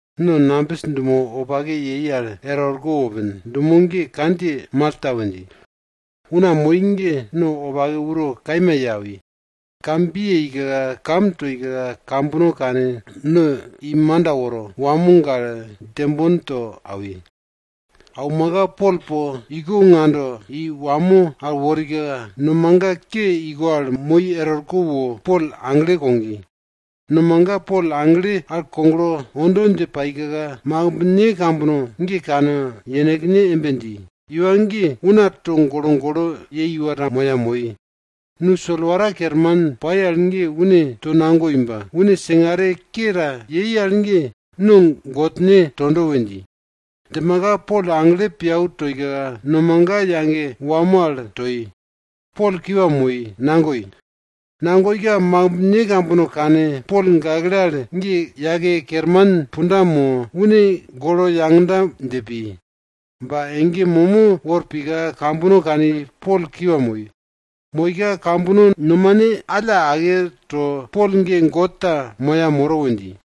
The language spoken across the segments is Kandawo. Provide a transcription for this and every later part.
No nambis dumo wopake yei al er orko wopin, dumo ge kandjiye Malta we dji. Una moi ge no wopake uro kaima ye awi. Kam bi yeika, kam toika kambono kane, no i manda woro, wamo gale, djembon to awi. Aumaka Pol po iko ngando i wamo al worika, nomaga ke iko al moi er orko wo Pol agle kogi. Nomaga Pol agle al koglo ondo dje paika, makimbne kambono ge kane yenekne embe dji, iwa ge una togolo golo yei iwa ta moya moi. Nu solwara kerman pai al ge une tonagoi ba, une singare ke ta yei al ge no godne tondo we dji. Djimaka Pol agle piau toika, nomaga yage wamo al toi, Pol kiwa moi, nagoi. Nagoika makimbne kambono kane Pol gakle al ge yake kerman punda mo, une golo yagda dje pi. Ba ege momo wor pika, kambono kani Pol kiwa moi. Moika, kambono nomane alla ake to, Pol ge god ta moya moro we dji.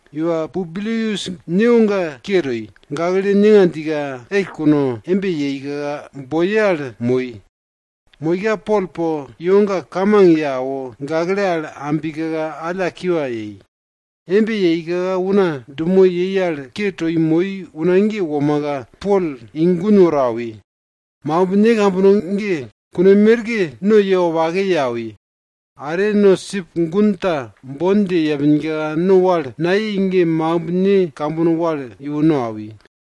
Iwa Publius newoga ke toi. Gakle ninga djika, ell kuno, embe yeika boye al moi. Moika Pol po iwoga kamang ye awo, gakle al ambika alla kiwa yei. Embe yeika una dumo yei al ke toi moi una ge womaka, Pol i gun woro awi. Makimbne kambono ge kune merke no ye wopake ye awi. Are no sip gun ta bon dje yepinka, no wal nayei ge makimbne kambono wal iwo no awi.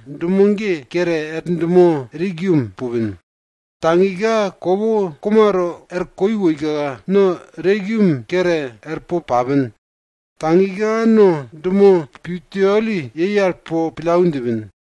dumo ge kere er dumo Regium pupin. Tagika kopo komato er koi woika, no Regium kere er po papin. Tagika no dumo Puteoli po pillau djipin.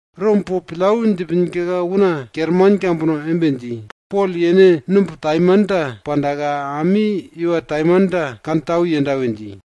Rom po pillau djipinka una kerman kambono embe dji, Pol yene numb taimanta pandaka, ami iwa taimanta kantau yenda we dji.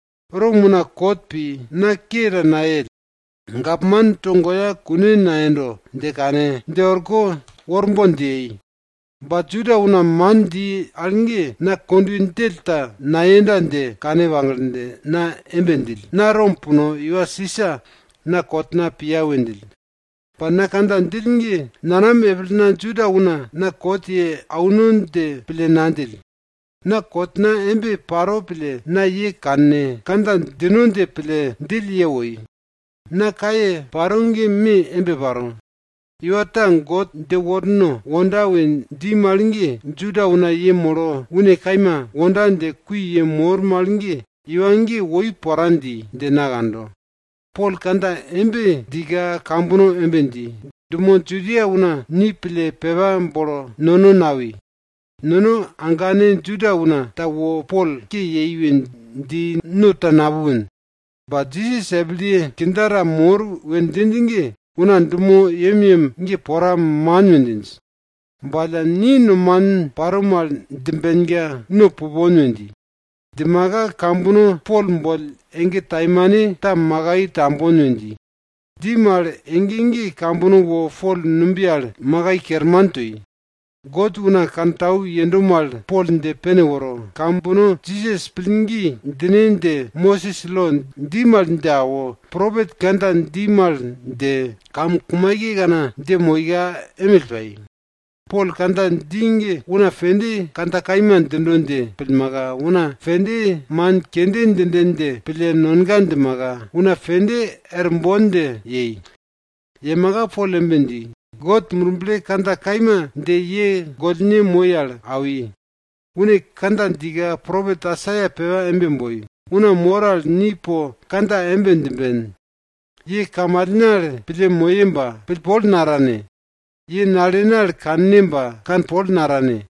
Rom una kot pi, na ke ta nayell. Gapman togoya kune nayendo dje kane, dje orko worbon dje yei. Ba Juda una man dji al ge, na kondwe djell ta nayenda dje kane pagle, na embe djill, na Rom puno, iwa Sisa na kotna piya we djill. Ba na kandja djill ge nanam epilna Juda una na kot ye auno dje pille nadjill. Na kotna embe paro pille na ye kane, kandja djino dje pille djill ye woi. Na kaye paro ge me embe paro, iwa ta God dje worno wonda we dji mal ge, Juda una yemolo une kaima wonda dje kui yemor mal ge, iwa ge woi pora dji dje na kando. Pol kandja embe djika kambono embe dji, dumo Judia una ni pille pepa bolo nono nawi. Nono agane Juda una ta wo Pol ke yei we dji no ta napupin. Ba Jisas epilye kindja ta mor we djinj ge, una dumo yemyem ge pora man we djinj. Ba alla ni nomanin paro mal djimbenka no pupon we dji. Djimaka kambono Pol boll ege taimanta makai tambon we dji. Dji mal ege ge kambono wo Pol numbiye al makai kerman toi. God dumoye wopake kantau yendo mal, Pol dje pene woro, kambono Jisas pillgi djine dje Mosis lo dji mal dje awo, propet kandja dji mal dje, kamkumaikekana dje moika emill pai. Pol kandja dji ge una pende kandja kaima djindo dje pillmaka, una pende man kende djinden dje pille nonga djimaka, una pende er bon dje yei. Yemaka Pol embe dji, God Murble kandja kaima dje ye gollne moi al awi. Une kandja djika propet Aisaia pepa embe boi, Una mor al ni po kandja embe djimben, ye kamalne al pille moye ba, pillpol natane. Ye nalene al kanne ba, kanpol natane.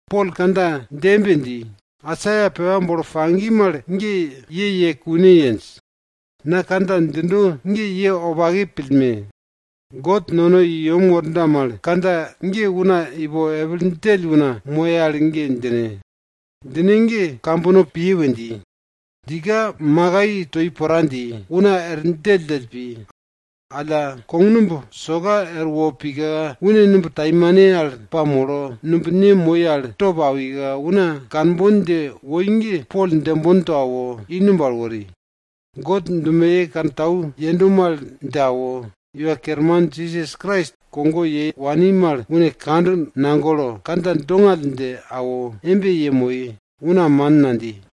Pol kandja dje embe dji, Aisaia pepa bolo pagi mal ge ye ye kune yenj. Na kandja djindo ge ye wopake pillme! God nono i yem worda mal kandja ge una ipo epil djell una moye al ge djine. Djine ge kambono piye! we dji. Djika makai toi pora dji, una er djelldjell pi. Alla kognumb soka erwo pika, une numb taimane al pamolo, numb ne moi al top awika, una kanbon dje woi ge, Pol djembon to awo, i numb al wori, God dumoye wopake kantau yendo mal dje awo, Iwa Kerman Jisas Krais kogo ye wani mal une kand nagolo, kandja dongall dje awo embe yemoi, una man nadji.